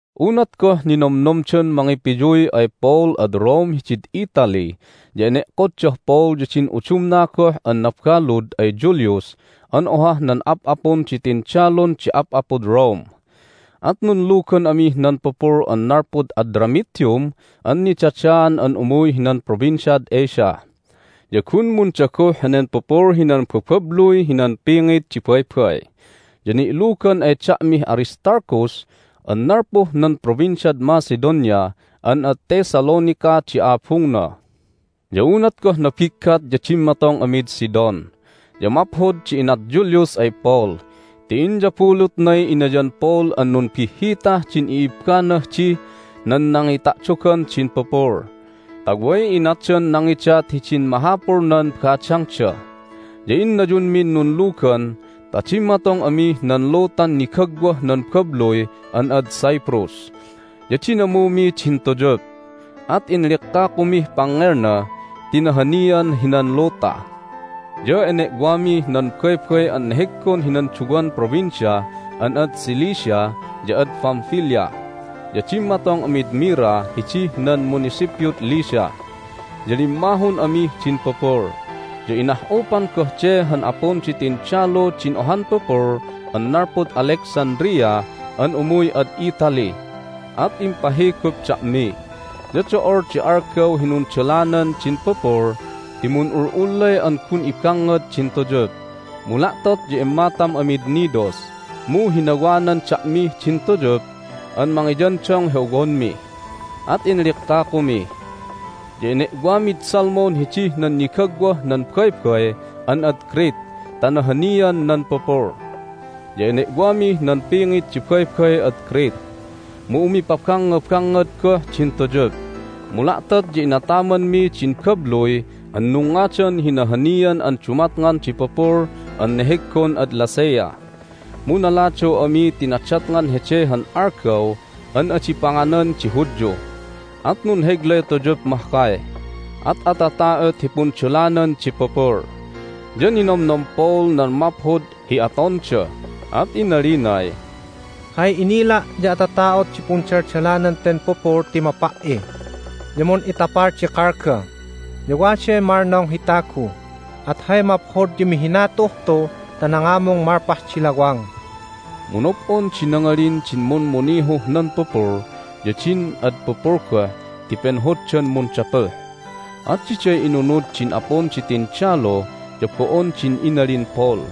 Unat goh ninomnomdan mangipiyuy ay Paul ad Rome hidid Italy ya ene'koddah Paul ya din udumna goh an nabalud ay Julius an ohah nan ap'apun di tindalun di ap'apud Rome. At nunlugan amih nan pupul an nalpud Adramyttium an nidadaan an umuy hinan Provinciad Asia, ya gun mundaguh henen pupul hinan bababluy hinan pingit di baybay. Ya ni'lugan ay da'mih Aristarchus an nalpuh nan Provinciad Macedonia an ad Thessalonica di abungna. Ya unat goh nabiggat ya dimmatong amid Sidon. Ya maphod di inat Julius ay Paul ti inyabulutnay inayan Paul an numbihhitah din i'ibbanah dih nan nangita'dogan din pupul, ta way inatdan nangidat hidin mahapulnan badangda. Ya innayunmin nunlugan ta dimmatong amih nan lutan nigagwah nan babluy an ad Cyprus. Ya dinamumi din tuyup, at inlikkakumih pangngelna ti nahanian hinan luta. Ya ene'wamih nan baybay an neheggon hinan duwan provincia an ad Cilicia ya ad Pamphylia, ya dimmatong amid Myra hidih nan munisipyud Lycia. Ya limmahun amih din pupul, ya inah'upan goh de han apun di tindalu din ohan pupul an nalpud Alexandria an umuy ad Italy, at impahigup da'mi. Ya do'ol di algaw hi nundalanan din pupul ti mun'ul'ullay an gun ibangngad din tuyup, mu la'tot ya immatam amid Cnidus. Mu hinawanan da'mih din tuyup an mangiyandong hi owonmi, at inlikkakumi. Ya ene'wamid Salmone hidih nan nigagwah nan baybay an ad Crete ta nahanian nan pupul. Ya ene'wamih nan pingit di baybay ad Crete, mu umipabangngabangngad goh din tuyup, mu la'tot ya inatamanmi din babluy an nungngadan hi Nahanian an Dumatngan di Pupul an neheggon ad Lasea. Mu naladaw ami ti nadatngan hede han Algaw an Adi Panganan di Hudyu, at nunheglay tuyup mahkay, at atata'ot hi pundalanan di pupul. Ya ninomnom Paul nan maphod hi atonda, at inalinay, "Hay inila' ya atata'ot di pundaldalanan ten pupul ti mapa"i, ya mun'itapal di kalga, ya waday malnong hi tagu. At hay maphod ya mihina tu'uh tu ta nangamung malpah di lawang." Mu nob'on di nangalin din mummunihuh nan pupul ya din ad pupul goh ti penhoddan mundapuh, at diday inunud din apun di tindalu ya bo'on din inalin Paul.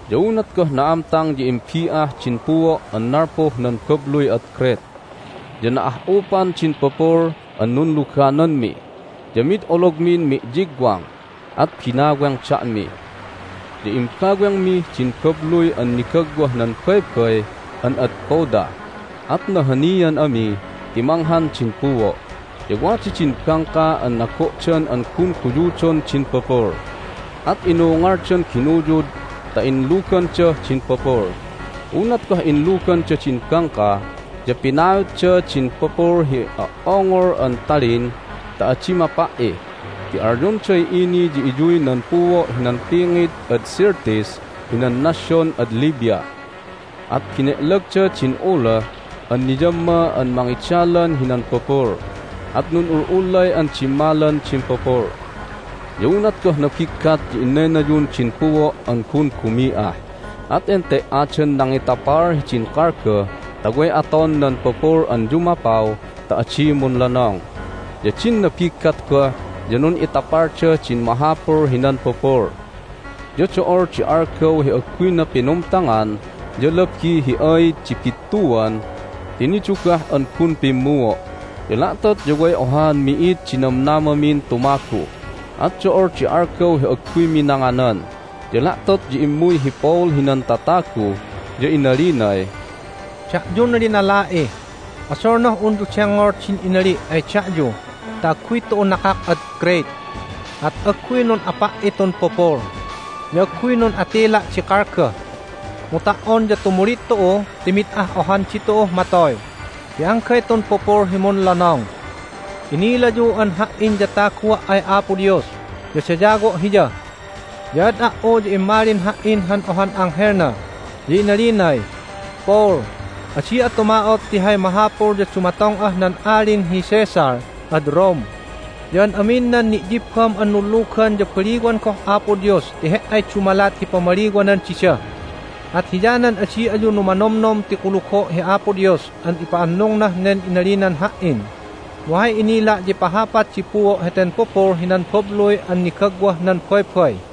Ya unat goh na'amtang ya imbi'ah din puo' an nalpuh nan babluy ad Crete. Ya na'ah'upan din pupul an nunlugananmi, ya mid ologmin mi'yigwang, at binaweng da'mi. Ya imbawengmih din babluy an nigagwah nan baybay an ad Cauda, at nahanian ami ti manghan din puo'. Ya wada din bangka an nago'dan an gun guyudon din pupul, at inungaldan ginuyud ta inlugandah din pupul. Unat goh inluganda din bangka ya pinautda din pupul hi o"ongol an talin ta adi mapa"i ti alyonday ini ya iyuy nan puo' hinan pingit ad Syrtis hinan nasyon ad Libya. At bene'lagda din uloh an niyamma an mangidalan hinan pupul, at nun'ul'ulay an dimmalan din pupul. Ya unat goh nabiggat ya inaynayun din puo' an gun bumi'ah, at ente"adan nangitapal hidin kalga ta way aton nan pupul an yumapaw ta adi munlonong. Ya din nabiggat goh ya nun'itapalda din mahapul hinan pupul. Ya do'ol di algaw hi agguyna pinumtangan ya labi hi aid di bittuan ti nidugah an gun pimmuo'. Ya la'tot ya way ohaan mi'id di namnamamin tumagu. At do'ol di algaw hi agguymi nanganan, ya la'tot ya immuy hi Paul hinan tatagu, ya inalinay, "Da'yun linala'i, odolnah unyu dengngol din inali' ay da'yu ta agguy tu'u nakak ad Crete, at agguy nun'apa"i tun pupul, ya agguy nun'atila' di kalga. Mu ta"on ya tumulid tu'u ti mid ah ohan ditu'uh matoy, ti anggay tun pupul hi munlonong. Inilayu an ha"in ya tagua' ay Apo Dios, ya dayawo' Hiya. Ya ad a"u ya immalin ha"in han ohan anghelna, ya inalinay, Paul, adi'a tuma'ot ti hay mahapul ya dumatong'ah nan Alin hi Caesar ad Rome, ya an amin nan ni'yibbam an nunlugan ya baliwan goh Apo Dios ti he"ay dumalat hi pamaliwanan dida. At hiyanan adi ayu numanomnom ti kulugo' hi Apo Dios an ipa'annungnah nen inalinan ha"in. Mu hay inila' ya ipahapat di puo' heten pupul hinan babluy an nigagwah nan baybay."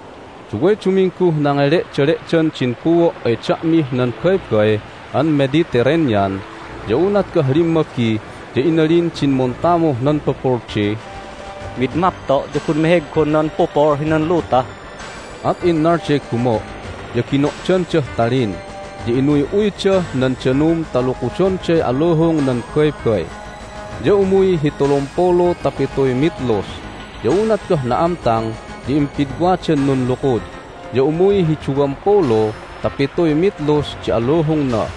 Duway dumingguh nangele'dale'dan din puo' ay da'mih nan Baybay an Mediterranean. Ya unat goh limmabi ya inalin din muntamuh nan pupul di, "Mid mapto' ya gun meheggon nan pupul hinan luta!" At innalday gumo', ya gino'dandah talin, ya inuy'uydah nan danum ta lukudonday aluhung nan baybay, ya umuy hi tulumpulu ta pituy mitlus. Ya unat goh na'amtang ya impidwadan nunlukud, ya umuy hi duwampulu ta pituy mitlus di aluhungna.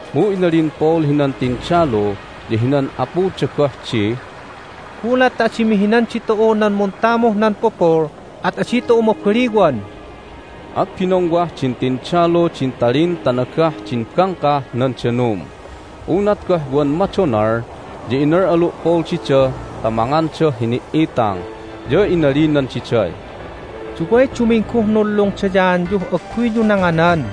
Mu inalin Paul hinan tindalu ya hinan apuda goh di, "Gulat ta adi mihinan ditu'u nan muntamuh nan pupul at adi tu'u mabaliwan." At binongwah din tindalu din talin ta nagah din bangkah nan danum. Unat goh wan madonal ya inal'alu' Paul dida ta mangandah hini"itang, ya inalinan diday, "Duway dumingguh nunlungdayaanyuh agguyyu nanganan.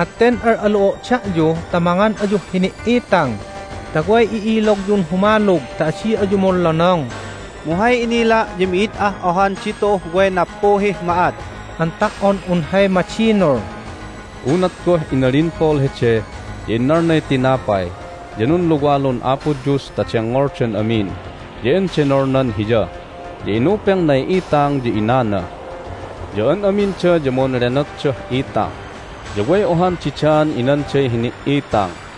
At ten al'alu'o' da'yu ta mangan ayuh hini"itang ta way i'ilogyun humalug ta adi ayu munlonong! Mu hay inila' ya mi'id ah ohan ditu'uh way nappuhih ma'at an ta"on un hay madinul." Unat goh inalin Paul hede ya innalnay tinapay, ya nunluwalun Apo Dios ta dengngoldan amin, ya endenolnan Hiya, ya inupengnay itang, ya inana. Ya an aminda ya munlenotdah itang, ya way ohan didaan inanday hini"itang.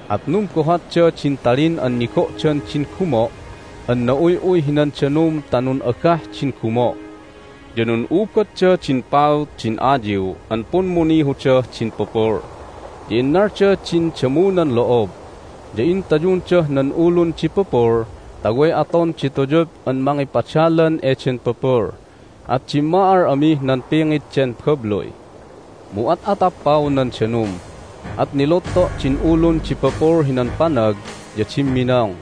At numbohatda din talin an nigo'dan din gumo' an na'uy'uy hinan danum ta nun'agah din gumo'. Ya nun'ubadda din paut din ayiw an pummunihudah din pupul, ya innalda din damunan lo'ob, ya intayundah nan ulun di pupul ta way aton di tuyup an mangipadalan eden pupul, at dimma'al amih nan pingit den babluy. Mu at'atappaw nan danum, at nilutto' din ulun di pupul hinan panag ya dimminong.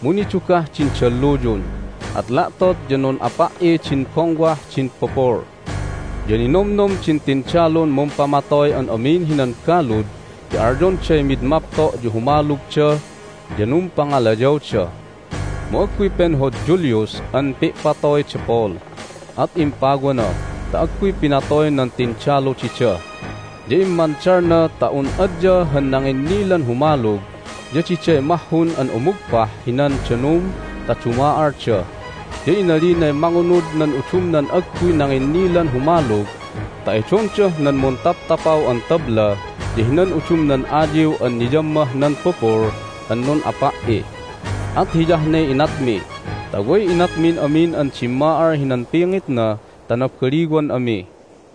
Mu nidugah din dalluyun, at la'tot ya nun'apa"i din bongwah din pupul. Ya ninomnom din tindalun mumpamatoy an amin hinan balud ti alyonday mid mapto' ya humalugda, ya numpangalayawda. Mu agguy penhod Julius an pi'patoy da Paul, at impawana ta agguy pinatoy nan tindalu dida. Ya immandalna ta un adya han nanginnilan humalug ya diday mahhun an umugpah hinan danum ta duma'alda. Ya inalinay mangunud nan udumnan agguy nanginnilan humalug ta edondah nan muntaptapaw an tabla ya hinan udumnan ayiw an niyammah nan pupul an nun'apa"i. At hiyah ne inatmi ta way inatmin amin an dimma'al hinan pingitna ta nabaliwan ami.